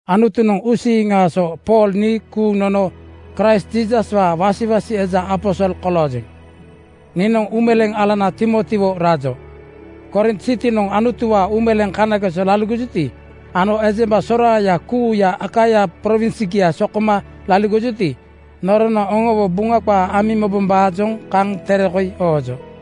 Anutunoŋ uusiiŋaa so Pool nii kuuŋ nono Kraist Jiisaswaa wasiwasi eja aposol koloojeŋ. Niinoŋ uumeleeŋ alanana Timotiwo rajo. Korint sitinoŋ Anutuwaa uumeleeŋ kanageso laligojuti ano ejemba soraaya kuuya Akaia prowinsgia sokoma laligojuti, noronoŋ oŋowo Buŋa qaa amiŋ mobombaajoŋ kaŋ tere koi oojo.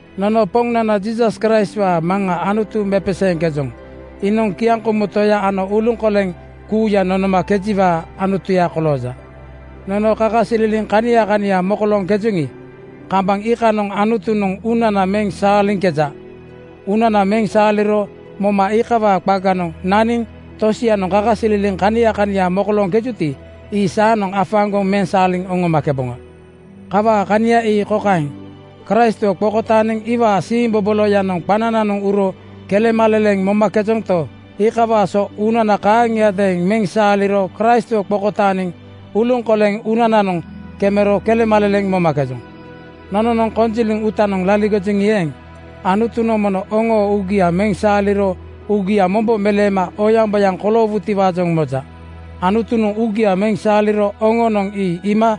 Nono Poŋnana Jiisas Kraistwaa Maŋa Anutu mepeseeŋkejoŋ. Iinoŋ kiaŋkomu Toya ano uluŋkoleŋ kuuya nonomakejiwaa Anutuya kolooja. Nono kakasililiŋ kania kania mokolooŋkejoŋi, kambaŋ iikanoŋ Anutunoŋ uunana meŋ saaliŋkeja. Uunana meŋ saaliro moma iikawaa qaganoŋ naniŋ tosianoŋ kakasililiŋ kania kania mokolooŋkejuti, ii saanoŋ afaaŋgoŋ meŋ saaliŋ oŋomakeboŋa. Kawaa kania ii kokaeŋ: Kraistwo qokotaaniŋ iwaa siimboboloyanoŋ qanananoŋ uro kelemaleleŋ momakejonto, iikawaa so uunana kaaŋiadeeŋ meŋ saaliro Kraistwo qokotaaniŋ uluŋkoleŋanoŋ uunananoŋ kemero kelemaleleŋ momakejoŋ. Nononoŋ konjiliŋ uutanoŋ laligojoŋi eeŋ, Anutunoŋ mono oŋoo uugia meŋ saaliro uugia mombo meleema oyaŋboyaŋ koloowutiwaajoŋ moja. Anutunoŋ uugia meŋ saaliro oŋonoŋ ii iima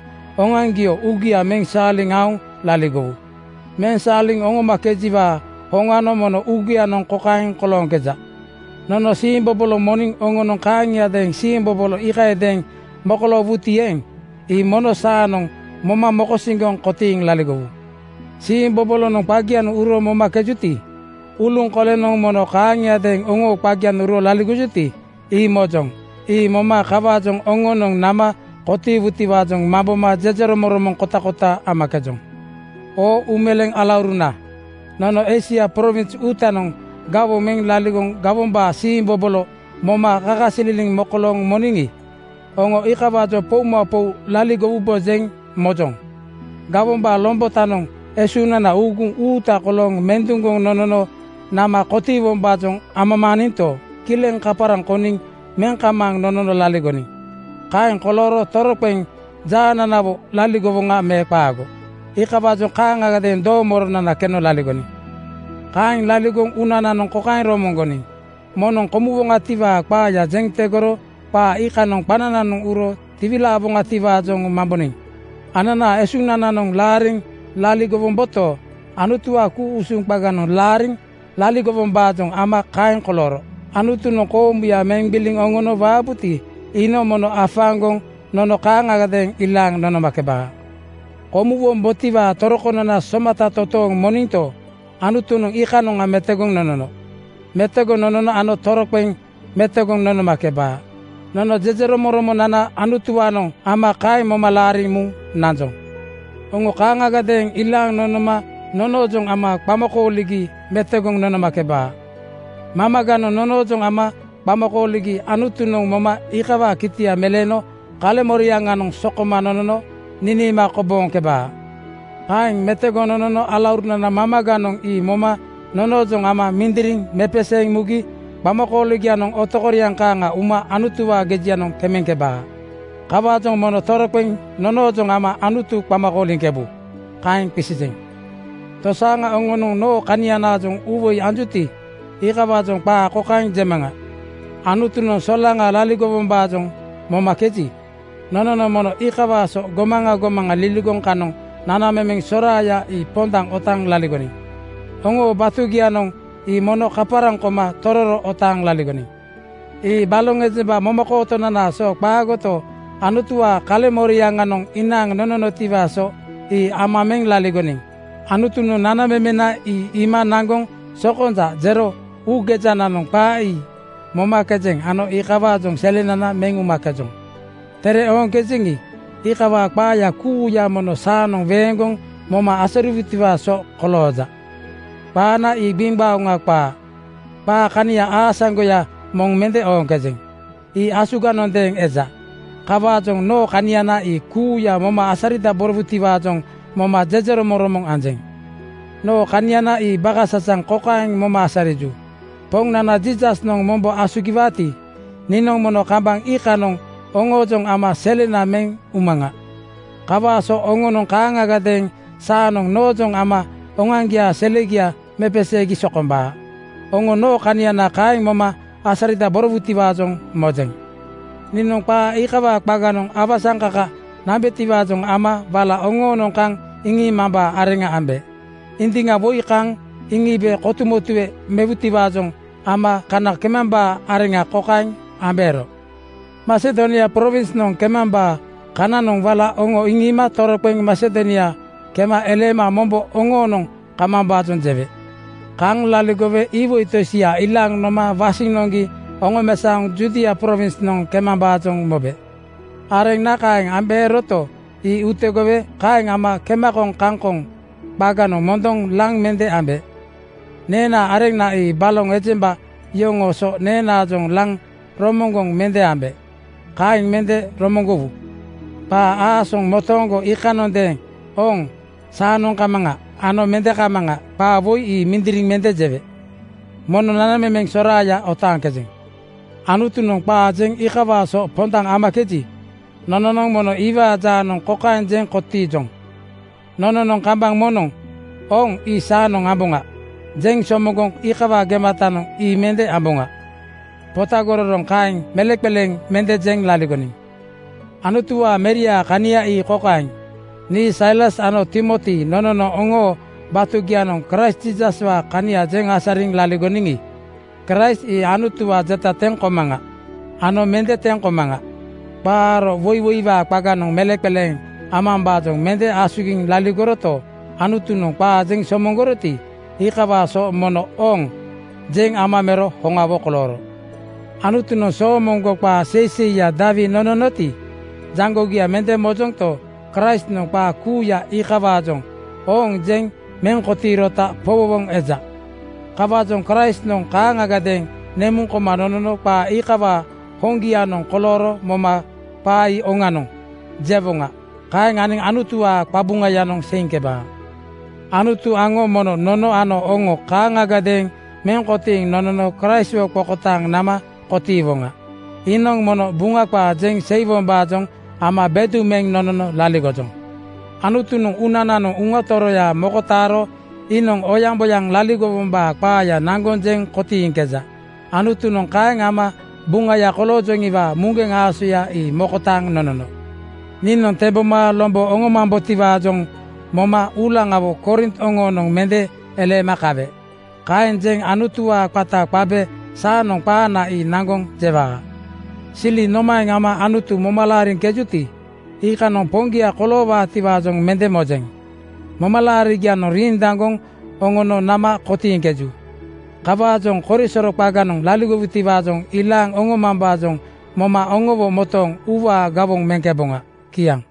oŋoaŋgio uugia meŋ saaliŋ aoŋ laligowu. Meŋ saaliŋ oŋomakejiwaa hoŋanoŋ mono uugianoŋ kokaeŋ kolooŋkeja: Nono siimbobolo moniŋ oŋonoŋ kaaŋiadeeŋ siimbobolo iikayadeeŋ mokoloowuti eeŋ, ii mono saanoŋ moma mokosiŋgoŋ kotiiŋ laligowu. Siimbobolonoŋ qagianoŋ uro momakejuti, uluŋkolenoŋ mono kaaŋiadeeŋ oŋoo qagianoŋ uro laligojuti, ii mojoŋ. Ii moma kawaajoŋ oŋonoŋ nama kotiiwutiwaajoŋ mamboma jejeromoŋromoŋ kotakota amakejoŋ. Oo uumeleeŋ alauruna, nono Eisia prowins uutanoŋ gawoŋ meŋ laligoŋ gawombaa siimbobolo moma kakasililiŋ mokolooŋ moniŋi, oŋo iikawaajoŋ poumapou laligowubojeŋ mojoŋ. Gawombaa lombotanoŋ esuŋnana uuguŋ uuta kolooŋ menduŋgoŋ nonono nama kotiiwombaajoŋ amamaaninto, kileŋ kaparaŋ koniŋ meŋ kamaaŋ nonono laligoniŋ. Kaeŋ kolooro toroqeŋ jaananawo laligowonaga me qaago, iikawaajoŋ kaaŋagadeeŋ doomoronana keno laligoniŋ. Kaeŋ laligoŋ uunananoŋ kokaeŋ romoŋgoniŋ: Moŋnoŋ komuwoŋatiwaa qaaya jeŋ tegoro qaa iikanoŋ qanananoŋ uro tiwilaawoŋatiwaajoŋ mamboniŋ. Ananaa esuŋnananoŋ laariŋ laligowomboto, Anutuwaa ku-usuŋ qaganoŋ laariŋ laligowombaajoŋ ama kaeŋ kolooro. Anutunoŋ koomuya meŋ gbiliŋ oŋono waabuti, iinoŋ mono afaaŋgoŋ nono kaaŋagadeeŋ ilaaŋ nonomakebaa. Komuwombotiwaa torokonana somata totooŋ moninto, Anutunoŋ iikanoŋa metogoŋ nonono. Metogoŋ nonono ano toroqeŋ metogoŋ nonomakebaa. Nono jejeromoŋromonana Anutuwaanoŋ ama kaeŋ moma laariŋ muŋ nanjoŋ. Oŋo kaaŋagadeeŋ ilaaŋ nonoma nonoojoŋ ama qama kooligi metogoŋ nonomakebaa. Mamaganoŋ nonoojoŋ ama qama kooligi Anutunoŋ moma iikawaa kitia meleeno kaleŋmoriaŋanoŋ sokoma nonono niniima kobooŋkebaa. Kaeŋ metogoŋ nonono alauruna mamaganoŋ ii moma nonoojoŋ ama mindiriŋ mepeseeŋ mugi qamakooligianoŋ otokoriaŋ kaaŋa uma Anutuwaa gejianoŋ kemeŋkebaa. Kawaajoŋ mono toroqeŋ noojoŋ ama Anutu qama kooliŋkebu. Kaeŋ qisijeŋ. Tosaaŋa oŋonoŋ noo kanianaajoŋ uuwoi anjuti, iikawaajoŋ qaa kokaeŋ jemaŋa: Anutunoŋ solaŋa laligowombaajoŋ momakeji, nononoŋ mono iikawaa so gomaŋa gomaŋa liligoŋ kanoŋ nanamemeŋ soraaya ii pondaŋ otaaŋ laligoniŋ. Oŋoo batugianoŋ ii mono kaparaŋ koma tororo otaaŋ laligoniŋ. Ii baloŋ ejemba momakootonanaa so qaagoto, Anutuwaa kaleŋmoriaŋanoŋ inaaŋ nononotiwaa so ii ama meŋ laligoniŋ. Anutunoŋ nanamemena ii iima naŋgoŋ “Sokonja,” jero uugejananoŋ qaa ii momakejeŋ ano iikawaajoŋ selenana meŋ umakejoŋ. Tere ooŋkejeŋi, iikawaa qaaya kuuya mono saanoŋ weeŋgoŋ moma asariwutiwaa so kolooja. Qaana ii gbiŋgbaoŋa qaa. Qaa kania aasaŋgoya moŋ mende ooŋkejeŋ. Ii asuganondeeŋ eja. Kawaajoŋ noo kaniana ii kuuya moma asaridaborowutiwaajoŋ moma jejeromoŋromoŋ anjeŋ. Noo kaniana ii bakasasaŋ kokaeŋ moma asariju: Poŋnana Jiisasnoŋ mombo asugiwaati, niinoŋ mono kambaŋ iikanoŋ oŋoojoŋ ama selena meŋ umaŋa. Kawaa so oŋonoŋ kaaŋagadeeŋ saanoŋ noojoŋ ama oŋoaŋgiaa selegia mepeseegi sokombaa. Oŋo noo kaniana kaeŋ moma asaridaborowutiwaajoŋ mojeŋ. Niinoŋ qaa iikawaa qaganoŋ awasaŋkaka nambetiwaajoŋ ama wala oŋoonoŋ kaŋ iŋiimambaa areŋa ambe. Indiŋa woi kaŋ iŋiibe kotumotue mewutiwaajoŋ ama kana kamambaa areŋa kokaeŋ ambe ero: Masedonia prowinsnoŋ kemambaa kananoŋ wala oŋo iŋiima toroqeŋ Masedonia kema eleema mombo oŋoonoŋ kamambaajoŋ jewe. Kaŋ laligowe iwoi tosia ilaaŋ noma wasiŋ noŋgi oŋomesaoŋ Judia prowinsnoŋ kemambaajoŋ mobe. Areŋna kaeŋ ambe eroto, ii utegowe. Kaeŋ ama kemakoŋkaŋkoŋ qaganoŋ mondoŋ laŋ mende ambe. Neenaa areŋna ii baloŋ ejemba yoŋoo so neenaajoŋ laŋ romoŋgoŋ mende ambe. Kaeŋ mende romoŋgowu. Qaa aasoŋ motooŋgo iikanondeeŋ “Ooŋ, saanoŋ kamaŋa,” ano “Mende kamaŋa,” qaa woi ii mindiriŋ mende jewe. Mono nanamemeŋ soraaya otaaŋkejeŋ. Anutunoŋ qaa jeŋ iikawaa so pondaŋ amakeji, nononoŋ mono iwaa jaanoŋ kokaeŋ jeŋ kotiijoŋ: Nononoŋ kambaŋ moŋnoŋ “Ooŋ, ii saanoŋ amboŋa,” jeŋ somoŋgoŋ iikawaa gematanoŋ “Ii mende amboŋa,” potagororoŋ kaeŋ meleŋqeleeŋ mende jeŋ laligoniŋ. Anutuwaa Meriaa kania ii kokaeŋ: Nii, Sailas ano Timoti nononoŋ oŋoo batugianoŋ Kraist Jiisaswaa kania jeŋ asariŋ laligoniŋi, Kraist ii “Anutuwaa jeta teŋ komaŋa,” ano “Mende teŋ komaŋa,” qaa aro woiwoiwaa qaganoŋ meleŋqeleeŋ amambaajoŋ mende asugiŋ laligoroto, Anutunoŋ qaa jeŋ somoŋgoroti, iikawaa so mono “Ooŋ!” jeŋ ama mero hoŋawo kolooro. Anutunoŋ soomoŋgo qaa (promis) seiseiya dawi nononoti, jaŋgogia mende mojonto, Kraistnoŋ qaa kuuya iikawaajoŋ “Ooŋ!” jeŋ meŋ kotiirota powowoŋ eja. Kawaajoŋ Kraistnoŋ kaaŋagadeeŋ nemuŋ koma nonono qaa iikawaa hoŋgianoŋ kolooro moma “Qaa ii oŋanoŋ,” jewoŋa. Kaeŋ aniŋ Anutuwaa qabuŋayanoŋ seiŋkebaa. Anutu aŋo mono nono ano oŋo kaaŋgadeeŋ meŋ kotiiŋ nonono Kraistwo qokotaaŋ nama kotiiwoŋa. Iinoŋ mono Buŋa qaa jeŋ seiwombaajoŋ ama bedu meŋ nonono laligojoŋ. Anutunoŋ uunananoŋ Uŋa Toroya mokotaaro iinoŋ oyaŋboyaŋ laligowombaa qaaya naŋgoŋ jeŋ kotiiŋkeja. Anutunoŋ kaeŋ ama buŋaya koloojoŋiwaa muŋgeŋ aasoya ii mokotaaŋ nonono. Niinoŋ temboma lombo oŋomambotiwaajoŋ moma uulaŋawo Korint oŋoonoŋ mende eleema kawe. Kaeŋ jeŋ Anutuwaa qata qabe saanoŋ qaana ii naŋgoŋ jewaa. Sili nomaeŋ ama Anutu moma laariŋkejuti, iikanoŋ poŋgia koloowaatiwaajoŋ mende mojeŋ. Momalaarigianoŋ rindaŋgoŋ oŋono nama kotiiŋkeju. Kawaajoŋ korisoro qaganoŋ laligowutiwaajoŋ ilaaŋ oŋomambaajoŋ moma oŋowo motooŋ uuwaa gawoŋ meŋkeboŋa. Kiaŋ.